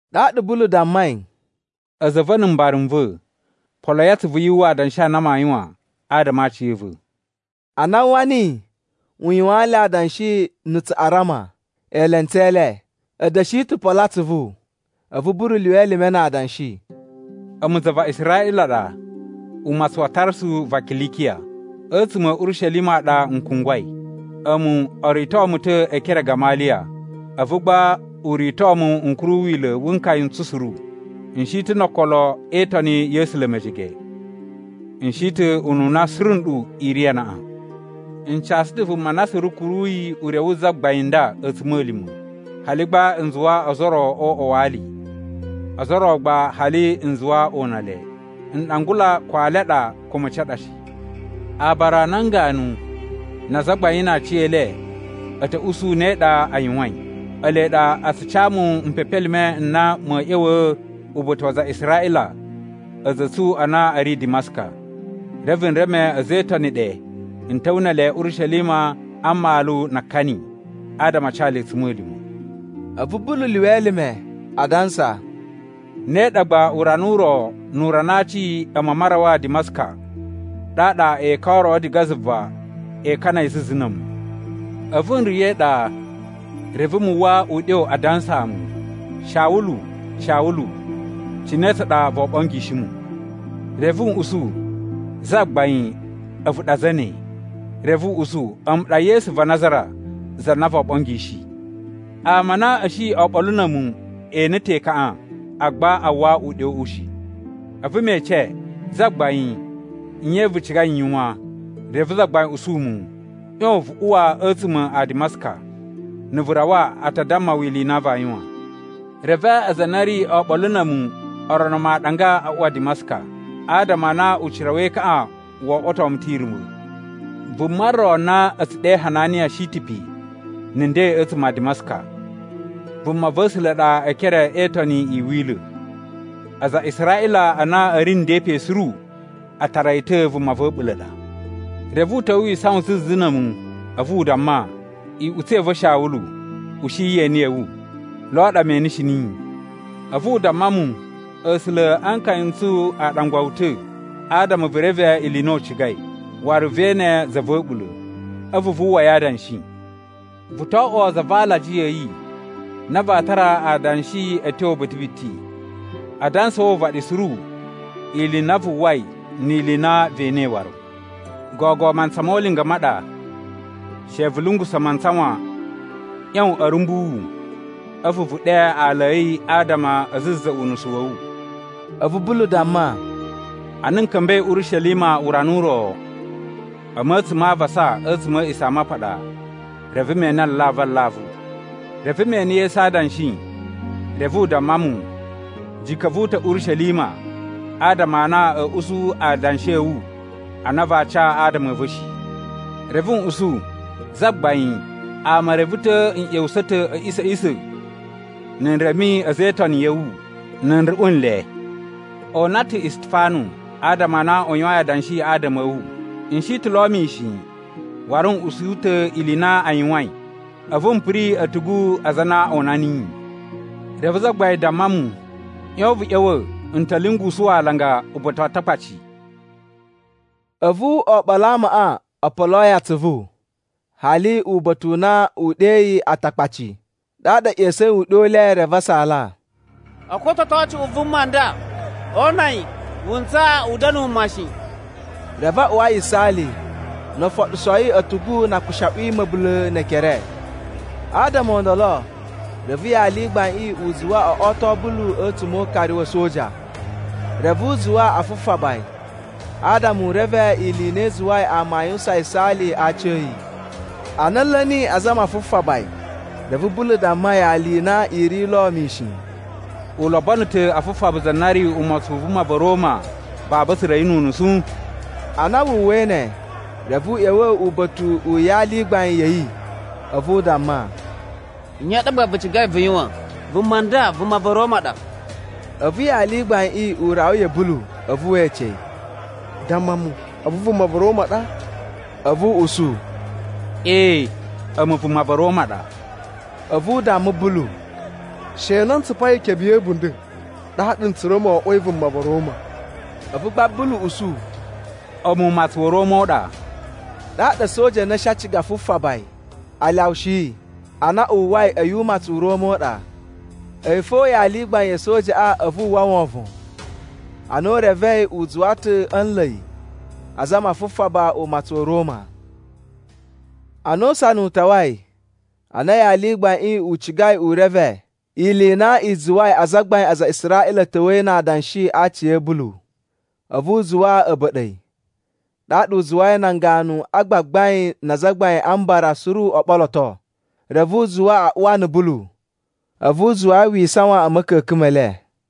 Ɗaɗa Bulu dammai, “A̱za̱ a̱ va̱ na̱ mbara n va̱, poloi atsuvu yu uwwa adanshi a na maa yuwan adama a aciya̱va̱.” Ana a uwwa niyi u yuwaan nle adanshi na̱ Tsuꞌarama elentsu e le, a̱ da̱shi ta̱ polo atsuvu. A̱vu Bulu lyuwa elime na adanshi, “A̱mu za va Israꞌila ɗa umatsun wa Tarsu va Kilikiya, a̱tsuma̱ a̱ Urishelima ɗa n kungwai. A̱mu o rito mu ta̱ e ekere a Gamaliya, a̱vu gba u rito mu n kuru Wila̱ wu nkaya n tsu suru. N shi ta̱ no okolo e itoni ya̱ A̱sula̱ mejege. N shi ta̱ ununa suru nɗu i ri anaꞌan. N casu ta̱ vuma na suru kuruyi Ure wu Zagbain nda a̱tsuma̱lima̱, hali gba n zuwa ozo o ro o uꞌwa wa ali, ozo o ro gba hali n zuwa o una le. N ɗangula ko ali a ɗa ko a̱ma̱ci a ɗa shi. Aabara a nan ganu na azagbain na aciyele a̱ ta̱ usu ne ɗa a yuwain. Ele ɗa a tsu ca mu mpepelime n na ma̱a̱ ꞌya̱wa̱a̱ uba̱ta̱ wa aza a Israꞌila a̱za̱ a̱ tsu a na a̱ ri Dimaska. Reve n reme a̱za̱ e Itoni ɗe n ta̱wa̱ ne ele Urishelima a mmalu na akani, adama a ca le a̱tsuma̱lima̱.” A̱vu Bulu lyuwa elime, adansa, “Ne ɗa gba urana u ro nu urana a aci a̱mu a marawaa Dimaska, ɗaɗa ekan o ro diga zuva e ikanai zuzu na̱ a̱mu. A̱vu n riya̱ e iɗa, reve mu uwwa uɗyo a dansaa mu, ‘Shawulu, Shawulu, cine tsa ɗa voo ɓongishi mu?’ “Reve n usu, ‘Zagbain, a̱vu ɗa zane?’ “Reve u usu, ‘A̱mu ɗa Yesu va Nazara, za na voo ɓongishi!’ Ama a na a̱ shi oɓolo na̱ a̱mu e ene ta̱ ekaꞌan, agba a uwwa uɗyoꞌo shi. “A̱vu me ece, ‘Zagbain, nye vu cigai n yuwan?’ “Reve Zagbain usu mu, ‘ꞌYon vu uwa a̱tsuma̱ a Dimaska. Na̱ vu rawa a ta damma wu ili i na vaa yuwan.’ “Reve aza a na a̱ ri oɓolo na̱ a̱mu o rono mu aɗanga a uwa Dimaska, adama a na ucira we ekaꞌan wo oꞌwoto mu ta̱ irumba̱. “Vuma ro na a̱ tsu ɗe Hananiya shi ta̱ pe na̱ nden a̱tsuma̱ a Dimaska. Vumava̱sula̱ ɗa e ekere e itoni i Wila̱. Aza a Israꞌila a na a̱ ri nden pe suru a tara yi ta̱ vuma va̱ a̱ɓula̱ ɗa. Reve u ta̱wa̱ wi isawan zuzu na̱ a̱mu, a̱vu u damma, ‘Iꞌutsa̱ i va̱ Shawulu, ushi yeni ya̱ wu.’ Lo ɗa me eneshi niyi! “A̱vu u damma mu, ‘A̱sula̱ a nkaya n tsu a ɗangwa wu ta̱ adama vu reve ili i na u cigai, waru ve ene Za va̱ A̱ɓula̱, a̱vu vu uwwa yi a adanshi. Vu to oꞌwo za va alajiya a̱ yi na vaa tara adanshi a̱ tyo uba̱ta̱ biti, a dansaa uvaɗi suru ili i na vu uwwai ni ili i na ve enei waru. Gogo mantsa mo ulinga ma ɗa, she vu lungusa̱ mantsa wan. ꞌYon, a̱ rumbu wu, a̱vu vu ɗe ala a̱ yi, adama a̱ za̱za̱ꞌwa̱ unusu wa̱ wu.’” A̱vu Bulu damma, “Ana n ka̱mba̱i Urishelima urana u ro, a̱mu a̱tsuma̱ a avasa a̱tsuma̱ a̱ A̱a̱ꞌisamapaɗa, reve me ene alavu alavu. Reve me ene Yesu a adanshi. Reve u damma mu, ‘Jika̱ vu uta̱ Urishelima adama a na a̱a̱ usu adanshi a̱ wu a na vaa ca adama a̱ va̱ shi.’ “Reve n usu, ‘Zagbain, ama e reve ta̱ n ꞌya̱wusa̱ ta̱ a̱ a̱ꞌisa̱ a̱ꞌisa̱ na̱ n remi a̱za̱ e Itoni ya̱ wu na̱ n ruꞌwi nle. O una ta̱ Istifanu adama a na u yuwain adanshi adama a̱ wu. N shi ta̱ lo mishin waru n usu ta̱ ili i na a yuwain, a̱vu m piri a̱tugu a aza a na o una niyi.’ “Reve Zagbain damma mu, ‘ꞌYon vu ꞌya̱wa̱ n ta̱ lyungusu wu alanga uba̱ta̱ wa Atakpaci.’” A̱vu oɓolo a amaꞌa o poloo yi atsuvu hali uba̱ta̱ u na u ɗeyi, “Atakpaci.” Ɗaɗa a̱ ꞌya̱sa̱in uɗyo u le reve a saala, “O kototo cuꞌun vuma nda! O una yi! Wu ntsaa u da̱na̱ wuma shi!” Reve a uwa yisaali no o foɗusoi a̱tugu na a kushaꞌwi ma̱bula̱ ne ekere. Adama o ndolo reve yali i gbaiꞌin u zuwa o oto Bulu a̱tsuma̱ o ukari wa̱ a̱soja. Reve u zuwa a fufaba yi, adama u reve ili i na i zuwai ama a yuwusan yisaali a aci a̱ yi. Ana a̱ nla̱ niyi azama a fufaba yi, reve Bulu damma yali i na i ri lo mishin, “U lobono ta̱ a fufaba za na ri umatsun u vuma va̱ Roma, babu a̱ tsura̱ yi nu unusu?” Ana wu uwwai ne, reve u ꞌya̱wa̱ uba̱ta̱ u yali i gbain ya̱ yi, a̱vu u damma, “Nye i ɗa gba vu cigai vu yuwan? Vuma nda vuma va̱ Roma ɗa.” A̱vu yali i gbaiꞌin u rawa ya̱ Bulu a̱vu we ece yi, “Damma mu, a̱vu vuma va̱ Roma ɗa?” A̱vu u usu, “Ee, a̱mu vuma va̱ Roma ɗa.” A̱vu u damma Bulu, “She na n tsupai ikebe ya̱ a̱bunda̱, ɗaɗa n tsura̱ mo oꞌwoi vuma va̱ Roma.” A̱vu gba Bulu usu, “A̱mu umatsun wa̱ Roma u ɗa.” Ɗaɗa a̱soja a na a̱ shi a cigai a fufaba yi, a lyawushi ana a uwwai a̱yi umatsun wa̱ Roma u ɗa. A̱yi fo yali i gbain ya̱ a̱sojaꞌa a̱vu wu uwwa wovon, ana u revei u zuwa ta̱ a̱ nla̱ yi azama a fufaba umatsun wa̱ Roma. Ana usana u tawai, ana yali i gbaiꞌin u cigai u reve ili i na i zuwai azagbain a aza a Israꞌila a̱ ta̱wa̱yi na adanshi a aci a̱ Bulu, a̱vu u zuwa a̱ ba̱ɗa̱ yi. Ɗaɗa u zuwai nan ganu a gbagbain na Azagbain a Mbara suru o ɓoloto. Reve u zuwa a uwa na̱ Bulu a̱vu u zuwa yi wi isawan a̱ ma̱ka̱ka̱n me le.